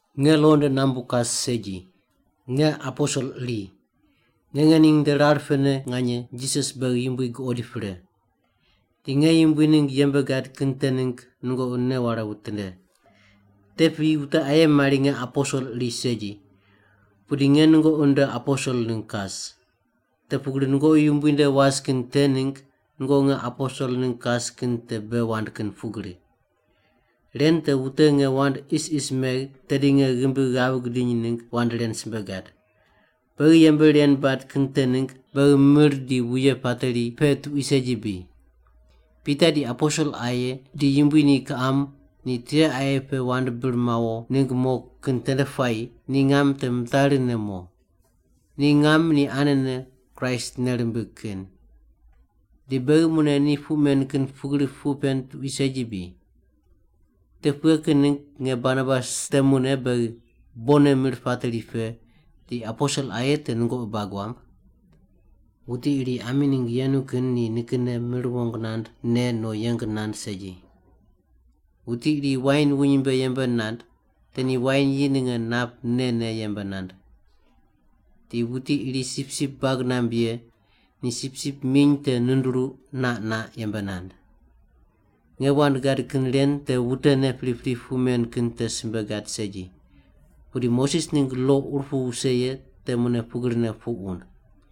Nge lo nde nambu kas segi. Nge aposel iri. Nge ngening nde rar pene nganye Jisas beghi Yumbui guqoid pre. Di nge Yumbui ningg yembe gad kin te ningg nungoqi nei ware witinde. Te piyi wute aye mari nge aposel iri segi, pudi nge nungoqi nde aposel ningg kas. Te pugri nungoqi Yumbui nde was kin te ningg nungoqi nge aposel ningg kas kin te bei wand kin pugri. Ren te wute nge wand isis megh tedi nge ghimbi ghav gidiny ningg wand ren simbe gad. Beghi yembe ren bad kin te ningg beghi mir di wuye pateri pe tuqui segi bri? Pita, di aposel aye, di Yumbui ni kiqam ni tiqe aye pe wand bir mawo ningg mo kin tende puayi ni ngam te mitari ne mo. Ni ngam ni anene Kraist nei rimbig kin. Di beghi mune ni puq men kin pugrine puq pen tuqui segi bri? Te pughe kin ningg nge Barnabas temune beghi bonne mir pateri pe, di aposel aye te nungoqi bag wamb? Wuti iri ami ningg yenu kin ni nikinne mir wong nand, ne, no yeng nand segi. Wuti iri wain wuny mbe yembe nand, te ni wain yi ninge nap ne ne yembe nand. Di wuti iri sipsip bag namb ye ni sipsip miny te nduruq naq naq yembe nand. Nge wand gad kin ren te wutene pripri puq men kin te simbe gad segi. Pudi Moses ningg lo ur pu wuse ye te mune pugrine puq wund.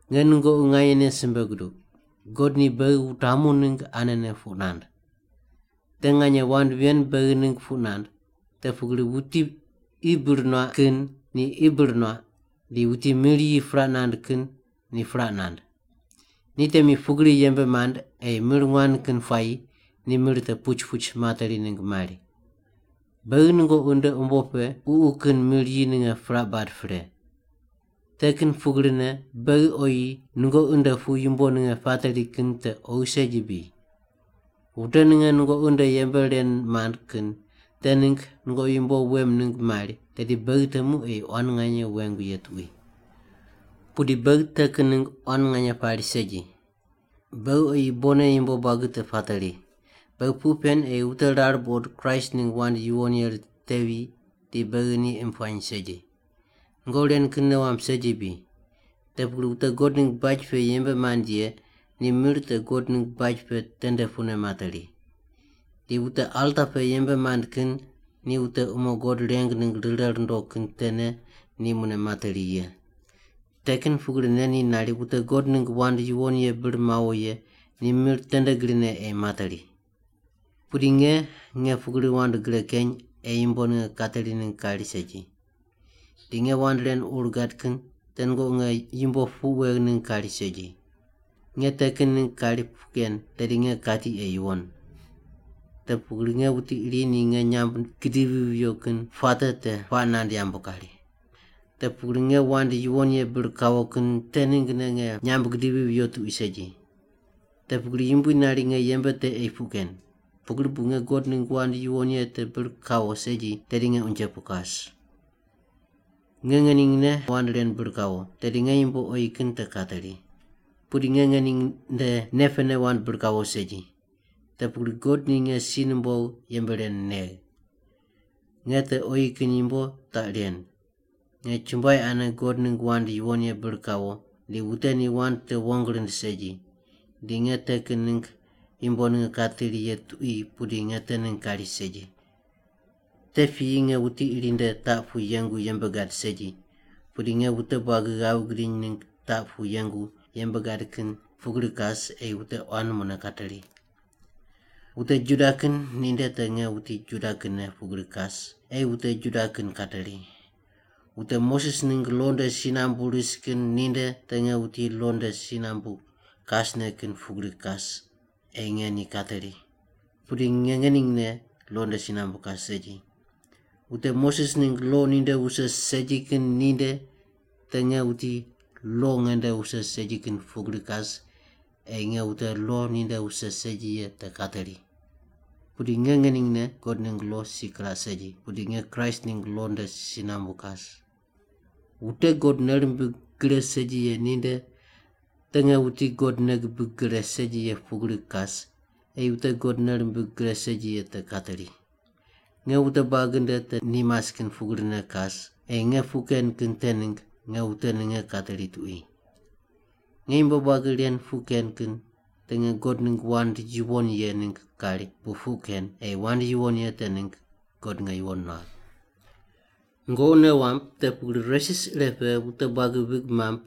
Nge nungoqi nganyene simbe guduq, God ni beghi wutamu ningg anene puq nand. Te nganye wand ven beghi ningg puq nand, te pugri wuti qi bir nuaq kin ni qi bir nuaq, di wuti mir yi puraq nand kin ni puraq nand. Ni temi pugri yembe mand ei mir nguan kin puayi ni mir te puch puch materi ningg mari. Beghi nungoqi nde umbo pe ququ kin mir yi ninge puraq bad pre. Te kin pugrine beghi oyi nungoqi nde pu yumbo ninge pateri kin te oghi segi bri? Wute ninge nungoqi nde yembe ren mand kin te ningg nungoqi yumbo wem ningg mari, tedi beghi temu ei quan nganye wengu ye tuqui. Pudi beghi te kin ningg quan nganye pari segi. Beghi oyi bonne yumbo buagi te pateri. Beghi puq pen ei wute rar buqod Kraist ningg wand yuwon ye ritevi di beghi ni imb puany segi. Nungoqi ren kin nei wamb segi bri? Te pugri wute God ningg baj pe yembe mand ye ni mir te God ningg baj pe tende pune materi. Di wute alta pe yembe mand kin ni wute umo God reng ningg rire rundo kin tene ni mune materi ye. Te kin pugrine ni nari wute God ningg wand yuwon ye bir mawo ye ni mir tende grine ei materi. Pudi nge, nge pugri wand gre keny ei yumbo ninge kateri ningg kari segi. Di nge wand ren ur gad kin te nungoqi nge yumbo puq wegh ningg kari segi. Nge te kin ningg kari puq ken tedi nge kati ei yuwon. Te pugri nge wuti iri ni nge nyamb gidivi viyo kin puate te puaq nand yambu kari. Te pugri nge wand yuwon ye bir kawo kin te ninggne nge nyamb gidivi viyo tuqui segi. Te pugri Yumbui nari nge yembe te ei puq ken. Pugri bu nge God ningg wand yuwon ye te bir kawo segi tedi nge unje pu kas. Nge ngeningne wand ren bir kawo, tedi nge yumbo oyi kin te kateri. Pudi nge ngening nde nei pene wand bir kawo segi. Te pugri God ni nge si numbogh yembe ren negh. Nge te oyi kin yumbo taq ren, nge chumbuai ane God ningg wand yuwon ye bir kawo, di wute ni wand te wong rind segi. Di nge te kin ningg yumbo ninge kateri ye tuqui pudi nge te ningg kari segi. Te piyi nge wuti iri nde taq pu yengu yembe gad segi, pudi nge wute buagi ghav gidiny ningg taq pu yengu yembe gad kin pugri kas ei wute quan mune kateri. Wute Juda kin ninde te nge wuti Juda kinne pugri kas ei wute Juda kin kateri. Wute Moses ningg lo nde si nambu ris kin ninde te nge wuti lo nde si nambu kasne kin pugri kas ei nge ni kateri. (Pudi nge ngeningne lo nde si nambu kas segi.) Wute Moses ningg lo ninde wuse segi kin ninde te nge wuti lo nge nde wuse segi kin pugri kas ei nge wute lo ninde wuse segi ye te kateri. (Pudi nge ngeningne God ningg lo si kiraq segi, pudi nge Kraist ningg lo nde si nambu kas.) Wute God nei rimbig gre segi ye ninde te nge wuti God nei gibig gre segi ye pugri kas ei wute God nei rimbig gre segi ye te kateri. Nge wute buagi nde te ni mas kin pugrine kas ei nge puq ken kin te ningg nge wute ninge kateri tuqui. Nge yumbo buagi ren puq ken kin te nge God ningg wand yuwon ye ningg kari bu puq ken ei wand yuwon ye te ningg God nge yuwon nuagh. Nungoqi nei wamb te pugri resis ire pe wute buagi vig mamb,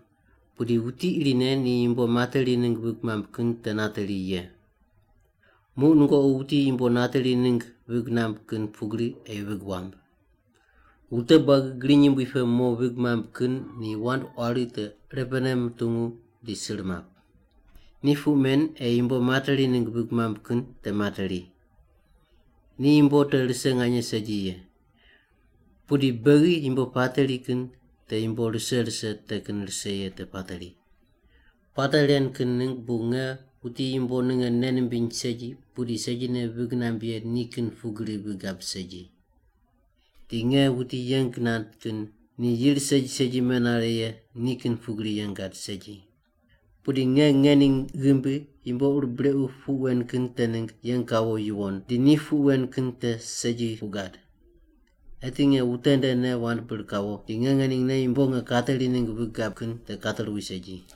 pudi wuti irine ni yumbo materi ningg vig mamb kin te nateri ye. Muq nungoqi wuti yumbo nateri ningg vig namb kin pugri ei vig wamb. Wute buagi griny yumbui pe mo vig mamb kin ni wand quari te irepene mutungu di sir map. Ni puq men ei yumbo materi ningg vig mamb kin te materi. Ni yumbo te rise nganye segi ye. Pudi beghi yumbo pateri kin te yumbo rise rise te kin rise ye te pateri. Puate ren kin ningg bu nge wuti yumbo ninge nei nimbiny segi pudi segine vig namb ye nikin pugri vig gab segi. Di nge wuti yeng nand kin ni yir segi segi menare ye nikin pugri yeng gad segi. Pudi nge ngening ghimbi yumbo ur brequ puq wen kin te ningg yeng kawo yuwon di ni puq wen kin te segi puq gad. Eti nge wute ndene wand bir kawo di nge ngeningne yumbo nge kateri ningg vig gab kin te kateruwi segi.